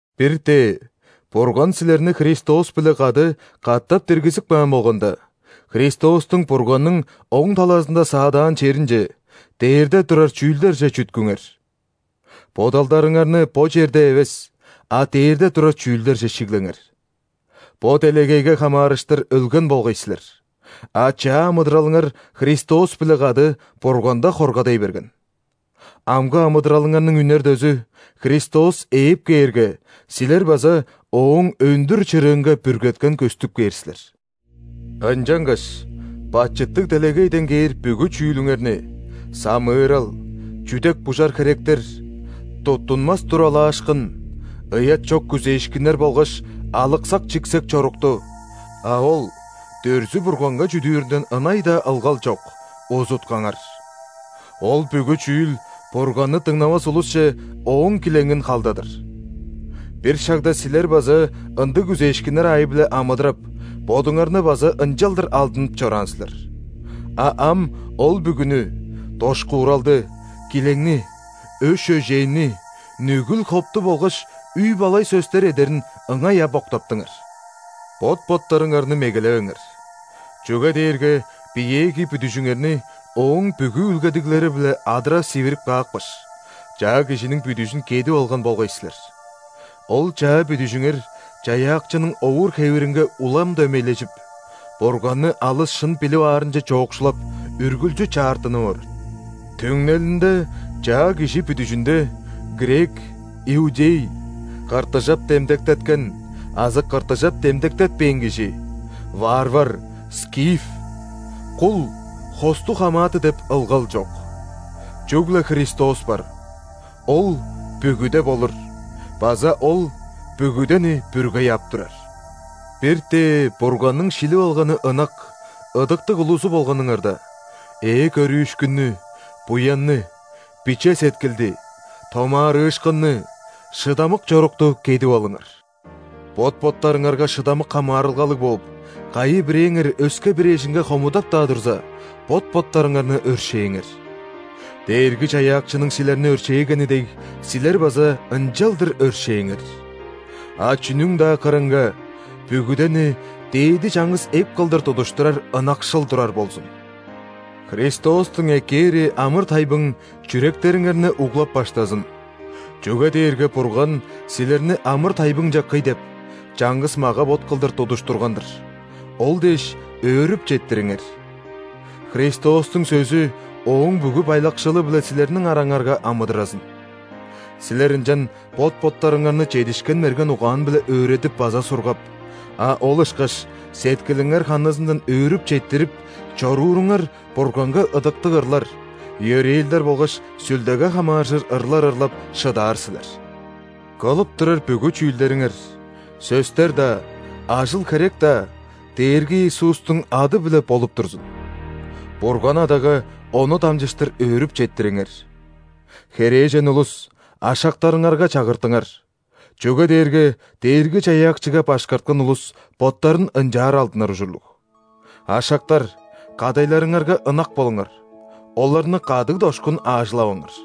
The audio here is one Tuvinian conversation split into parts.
Бир-тээ Бурган силерни Христос-биле кады катап диргизип каан болганда, Христостуң Бурганның оң талазында саадаан черинче, дээрде турар чүүлдерже чүткүңер. Бодалдарыңарны бо черде эвес, а дээрде турар чүүлдерже шиглеңер. Бо делегейге хамаарыштыр өлген болгай силер, а чаа амыдыралыңар Христос-биле кады Бурганда хоргадай берген. Амгы амыдыралыңарның үнер дөзү – Христос ээп кээрге, силер база Ооң өндүр чырыынга бүргеткен көстүп кээр силер. Ынчангаш бачыттыг делегейден кээр бүгү чүүлүңерни: самыырал, чүдек-бужар херектер, туттунмас туралаашкын, ыят чок күзээшкиннер болгаш алыксак-чиксек чорукту (а ол дүрзү-бурганга чүдүүрүнден ынай-даа ылгал чок) узуткаңар! Ол бүгү чүүл Бурганны дыңнавас улусче Ооң килеңин халдадыр. Бир шагда силер база ындыг күзээшкиннер аайы-биле амыдырап, бодуңарны база ынчалдыр алдынып чораан силер. А ам ол бүгүнү: дошкууралды, килеңни, өш-өжээнни, нүгүл-хопту болгаш үй-балай сөстер эдерин ыңай ап октаптыңар. Бот-боттарыңарны мегелевеңер, чүге дээрге биеэги бүдүжүңерни ооң бүгү үүлгедиглери-биле адыра сивирип каапкаш, чаа кижиниң бүдүжүн кедип алган болгай силер. Ол чаа бүдүжүңер Чаяакчының овур-хевиринге улам дөмейлежип, Бурганны алыс шын билип аарынче чоокшулап, үргүлчү чаартынып орар. Түңнелинде чаа кижи бүдүжүнде: грек, иудей; ·кыртыжап демдектеткен азы кыртыжап демдектетпээн кижи; варвар, скиф; кул, хостуг хамааты деп ылгал чок. Чүгле Христос бар, Ол – бүгүде болур база Ол – бүгүдени бүргей ап турар! Бир-тээ Бурганның шилип алганы ынак, ыдыктыг улузу болганыңарда, ээ көрүүшкүннү, буянны, биче сеткилди, томаарыышкынны, шыдамык чорукту кедип алыңар. Бот-боттарыңарга шыдамык хамаарылгалыг бооп, кайы-бирээңер өске-бир эжинге хомудап-даа турза, бот-боттарыңарны өршээңер. Дээрги-Чаяакчының силерни өршээгени дег, силер база ынчалдыр өршээңер! А чүнүң-даа кырынга бүгүдени дээди чаңгыс эп кылдыр тудуштурар ынакшыл турар болзун. Христостуң эккээри амыр-тайбың чүректериңерни углап-баштазын, чүге дээрге Бурган силерни амыр-тайбыңче кый деп, чаңгыс мага-бот кылдыр тудуштурган-дыр. Ол дээш өөрүп четтириңер! Христостуң сөзү ооң бүгү байлакшылы-биле силерниң араңарга амыдыразын. Силер ынчан бот-боттарыңарны чедишкен мерген угаан-биле өөредип база сургап, а ол ышкаш сеткилиңер ханызындан өөрүп четтирип чорууруңар Бурганга ыдыктыг ырлар, йөрээлдер болгаш Сүлдеге хамааржыр ырлар ырлап шыдаар силер. Кылып турар бүгү чүүлдериңер – сөстер-даа, ажыл-херек-даа Дээрги Иисустуң ады-биле болуп турзун, Бурган Адага Ону дамчыштыр өөрүп четтириңер. Херээжен улус, ашактарыңарга чагыртыңар, чүге дээрге Дээрги-Чаяакчыга башкарткан улус боттарын ынчаар алдынар ужурлуг. Ашактар, кадайларыңарга ынак болуңар, оларны кадыг-дошкун аажылаваңар.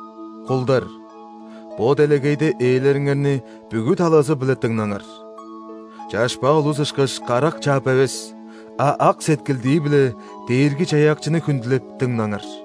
Кулдар, бо делегейде ээлериңерни бүгү талазы-биле дыңнаңар. Чашпаа улус ышкаш, карак чаап эвес, а ак сеткилдии-биле Дээрги-Чаяакчыны хүндүлеп, дыңнаңар.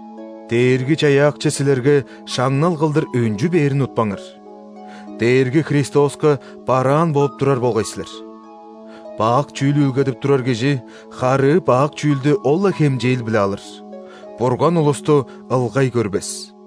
Дээрги-Чаяакчы силерге шаңнал кылдыр өнчү бээрин утпаңар. Дээрги Христоска бараан бооп турар болгай силер. Бак чүүл үүлгедип турар кижи харыы бак чүүлдү ол-ла хемчээл-биле алыр; Бурган улусту ылгай көрбес.